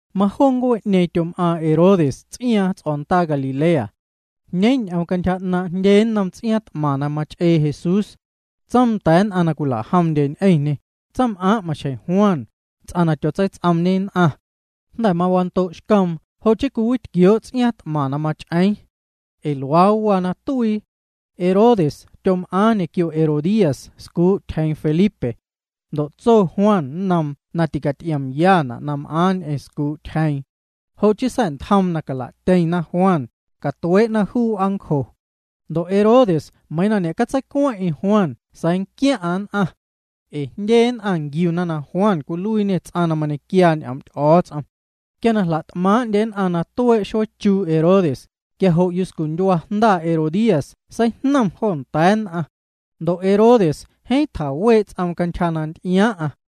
Majoo ncuee'ñeeⁿ tyom'aaⁿ Herodes ts'iaaⁿ ts'o̱ndaa Galilea. Jñeeⁿ ñ'oom cantyja 'naaⁿ' jndye nnom ts'iaaⁿ t'maⁿ na mach'ee Jesús. Tsoom nda̱a̱ nn'aⁿ na cwila'jomndye ñ'eⁿñê: —Tsaⁿm'aaⁿ, maxjeⁿ Juan, ts'aⁿ na tyotseits'oomñe nn'aⁿ. Jnda̱ wando'xcoom jo' chii cwiwitquioo' ts'iaaⁿ t'maⁿ na mach'eeⁿ. Ee luaa waa na tuii. Herodes tyom'aaⁿ ñequio Herodías, scuu' tyjeeⁿ Felipe. Ndo' tso Juan nnoom na ticaty'iomyana' na m'aaⁿ ñ'eⁿ scuu' tyjeeⁿ. Jo' chii sa̱'ntjoom na cala'tyeⁿna Juan, catuee'na juu w'aancjo. Ndo' Herodes, meiiⁿ na ñe'catseicueⁿ'eⁿ Juan sa̱a̱ nquiaⁿ'aⁿ nn'aⁿ. Ee jndye nn'aⁿ nquiuna na Juan cwiluiiñe ts'aⁿ na mañequiaa ñ'oom' Ty'o̱o̱ts'om. Quia na jla't'maaⁿ'ndye nn'aⁿ na tuee' xueechuu' Herodes, quia jo' yuscundyua jnda Herodías seijnom jo nda̱a̱ nn'aⁿ. Ndo' Herodes jeeⁿ tjawee' ts'oom cantyja na nty'iaaⁿ'aⁿ.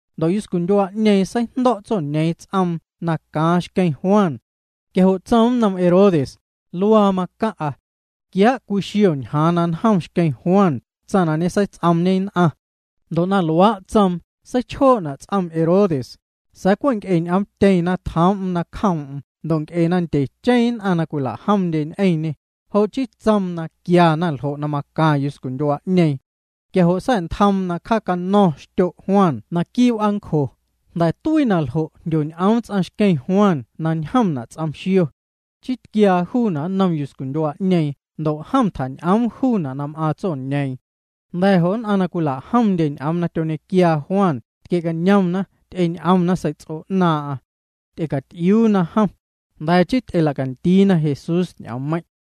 Ndo' yuscundyua'ñeeⁿ seijndo̱' tsoñeeⁿ ts'oom na caaⁿ xqueⁿ Juan. Quia jo' tsoom nnom Herodes: —Luaa macaⁿ'a. Quiaa' cwii xio ñjaaⁿ na njom xqueⁿ Juan, tsaⁿ na ñeseits'oomñe nn'aⁿ. Ndo' na luaa' tsoom, seichjoo'na' ts'om Herodes, sa̱a̱ cwe' nc'e ñ'omtyeⁿ na tjoom'm nacjoom'm ndo' nc'e na ndyecheⁿ nn'aⁿ na cwila'jomndye ñ'eⁿñê, jo' chii tsoom na quiana ljo' na macaⁿ yuscundyua'ñeeⁿ. Quia jo' sa̱'ntjoom na cjaacano̱ⁿ xtyo' Juan naquii' w'aancjo. Jnda̱ tuii na ljo', jndyoñ'oom ts'aⁿ xqueⁿ Juan na njomna' ts'om xio. Chii tquiaa juuna' nnom yuscundyua'ñeeⁿ ndo' jom tjañ'oom jo' na m'aaⁿ tsoñeeⁿ. Jnda̱ jo' nn'aⁿ na cwila'jomndye ñ'oom na tyoñequiaa Juan tquie'cañomna, ty'eñ'omna sei'ts'o 'naaⁿ'aⁿ. Ty'ecaty'iuuna jom, jnda̱ chii ty'ela'candiina Jesús ñ'oommeiⁿ'.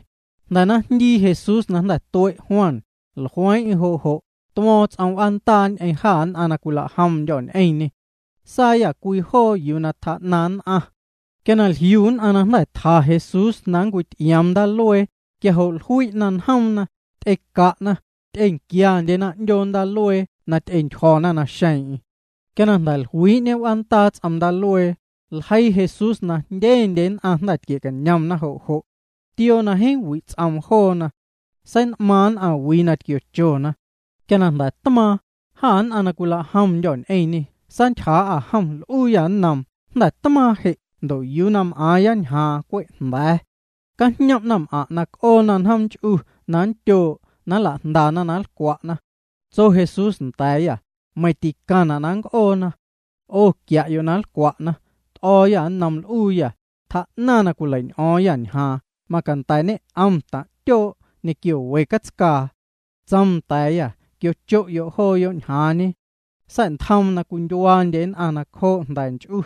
Jnda̱ na jndii Jesús na jnda̱ tue' Juan, jlueeⁿ'eⁿ jo', tuo̱o̱ⁿ ts'om w'aandaa ñ'eⁿ jâ nn'aⁿ na cwila'jomndyô̱ ñ'eⁿñê. Saayâ cwii joo yuu na tjaa'naⁿ nn'aⁿ. Quia jliu nn'aⁿ na jnda̱ tja Jesús na nncwity'ioom ndaaluee, quia jo' jlui'na njoomna, ty'eca'na, ty'enquiandyena 'ndyoo ndaaluee na ty'entyjo̱na naxeeⁿ'eⁿ. Quia na jnda̱ jluii'ñe w'aandaa ts'om ndaaLuee, ljeii Jesús na teijndyendye nn'aⁿ jnda̱ tquie'cañom jo' jo'. Tioo na jeeⁿ wi' ts'oom joona. Sein'maaⁿ nn'aⁿwii na tquiochona. Quia na jnda̱ tmaaⁿ, jâ nn'aⁿ na cwila'jomndyô̱ ñ'eⁿñê saantyjaa'â jom, l'uuyâ nnoom: —Jnda̱ tmaaⁿ je' ndo' yuu na m'aaⁿya ñjaaⁿñe cwe' jnda̱a̱. Cajñom' naⁿm'aⁿ' na c'oona njoom nch'u na nndyoo' na nla'jndana na nlcwa'na. Tso Jesús nda̱a̱yâ: —Meiⁿ ticaⁿna' na nnc'oona. 'O quia'yo' na nlcwa'na. T'o̱o̱yâ nnoom, l'uuyâ: —Tjaa'naⁿ na cwilei'ñ'o̱o̱ⁿyâ ñjaaⁿ, macanda̱ ñe'om taⁿ' tyoo' ñequio we catscaa. Tsoom nda̱a̱yâ: —Quiocho'yo' joona' ñjaaⁿñe. Sa̱'ntjoom na cwindyuaandye nn'aⁿ nacjoo' jnda̱ nch'u.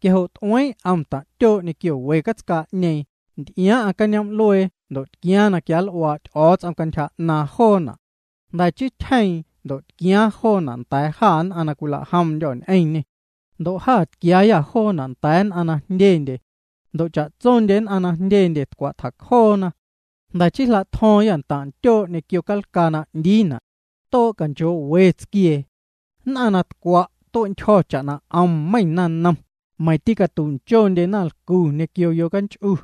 Quia jo' t'ueeⁿ 'om taⁿ' tyoo' ñequio we catscaa'ñeeⁿ, nty'iaaⁿ'aⁿ cañoom'luee ndo' tquiaaⁿ na quianl'uaa' Ty'o̱o̱ts'om cantyja 'naaⁿ joona'. Jnda̱ chii tyjeeⁿ ndo' tquiaaⁿ joona' nda̱a̱ jâ nn'aⁿ na cwila'jomndyô̱ ñ'eⁿñê. Ndo' jâ tquiaayâ joona' nda̱a̱ nn'aⁿ na jndyendye. Ndo' cha'tsondye nn'aⁿ na jndyendye tcwa' tjacjoo. Jnda̱ chii jla'tjo̱o̱ⁿyâ ntaⁿ' ntyoo' ñequio calcaa na 'ndiina'. Too' canchoo'we tsquiee. Nn'aⁿ na tcwa' tue'ntyjo̱ cha'na 'om meiⁿ naⁿnom, meiⁿ tîcatu'nchondye naⁿlcu ñequio yocanch'u.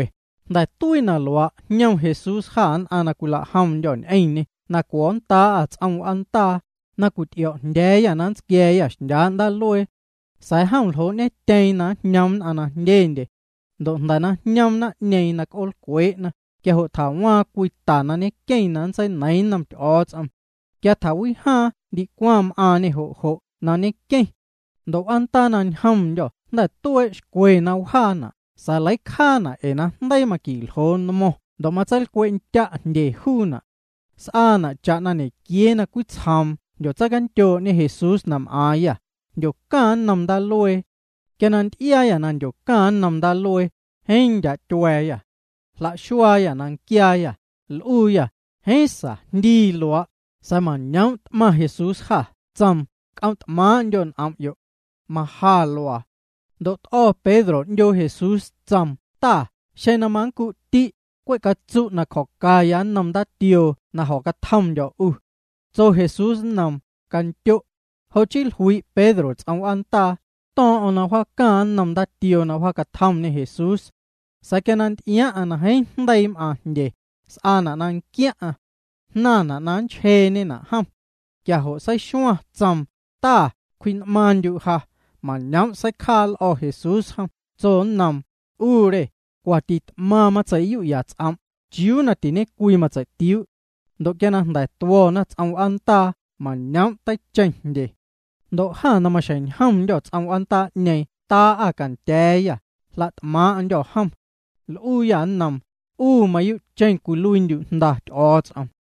Jnda̱ tuii na luaa' jñom Jesús jâ nn'aⁿ na cwila'jomndyô̱ ñ'eⁿñê na cuo̱nndaa'â ts'om w'aandaa, na cwity'io̱o̱'jndya̱a̱yâ na nntsquia̱a̱yâ xndyaa' ndaaluee. Sa̱a̱ jom ljoo'ñetyeeⁿ na njñoom nn'aⁿ na jndyendye. Ndo' jnda̱ na jñoom naⁿ'ñeeⁿ na c'oolcwee'na, quia jo' tjawaaⁿ cwii ta na ñenqueⁿ na nntseineiiⁿ nnom Ty'o̱o̱ts'om. Quia tjawijaaⁿ ndicwaⁿ m'aaⁿñê jo' jo' na ñenqueⁿ. Ndo' w'aandaa na ñjomndyô̱ jnda̱ tuee' xcwe na wjaana' sa̱a̱ leicjaana' ee na jndeii maqui'ljoo nmo̱ⁿ ndo' matseilcwe'tya' jndye juuna'. S'aana' cha'na ñequiee na cwitsjoom jndyotseicandyoo'ñe Jesús na m'aaⁿyâ, jndyocaⁿ nnom ndaaluee. Quia na nty'iaayâ na mandyocaⁿ nnoom ndaaluee, jeeⁿ ndyaa' tyua̱a̱yâ. Jlaxuaayâ na nquiaayâ, l'uuyâ: —Jeeⁿ sa, jndii luaa'. Sa̱a̱ mañoom' t'maⁿ Jesús jâ, tsoom: —C'om' t'maaⁿ'ndyo' n'om'yo'. Maja luaa. Ndo' t'o̱ Pedro 'ndyoo Jesús, tsoom: —Ta, xeⁿ na manncu'ti', cwe' catsu' na cjo̱ca nnom ndaatioo na jo̱catjomndyo̱ 'u. Tso Jesús nnoom: —Candyo'. Jo' chii jlui' Pedro ts'om w'aandaa, to̱o̱ⁿ'o̱ⁿ na mawjaacaⁿ nnom ndaatioo na mawjaacatjomñê Jesús. Sa̱a̱ quia na nty'iaaⁿ'aⁿ na jeeⁿ jndeii m'aaⁿ jndye, s'aana' na nquiaⁿ'aⁿ. Jnaⁿna' na nchjeeñena' jom. Quia jo' seixuaⁿ, tsoom: —Ta, cwji'n'maaⁿndyu' ja. Mañoom' seicjaa l'o̱ Jesús jom, tsoom nnom: —'U re, cwa tit'maⁿ matsei'yu'ya' ts'om', ¿chiuu na tiñecwii matsei'tiuu'? Ndo' quia jnda̱ tuo̱na ts'om w'aandaa, mañoom' teicheⁿ jndye. Ndo' jâ na maxjeⁿ ñjomndyô̱ ts'om w'aandaa'ñeeⁿ taa'â cantya̱a̱yâ, jla't'maaⁿ'ndyô̱ jom. L'uuyâ nnoom: —'U mayuu'cheⁿ cwiluiindyu' Jnda Ty'o̱o̱ts'om.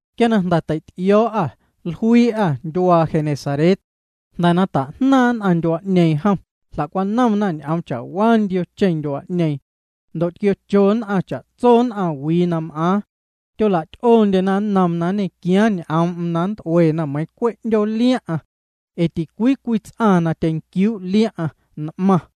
Quia na jnda̱ tei'ty'io̱o̱'â, jluii'â ndyuaa Genesaret. Jnda̱ na ta'jnaaⁿ' nn'aⁿ ndyuaa'ñeeⁿ jom, jla'cwanomna ñ'oom cha'waa ndiocheⁿ ndyuaa'ñeeⁿ. Ndo' tquiocho nn'aⁿ cha'tso nn'aⁿwii na m'aaⁿ. Tyola'ty'oondyena nnoom na nñequiaaⁿ ñ'oom'm na nnt'uena meiiⁿ cwe' 'ndyoo liaⁿ'aⁿ. Ee ticwii cwii ts'aⁿ na tyenquiuu' liaⁿ'aⁿ, n'maⁿ.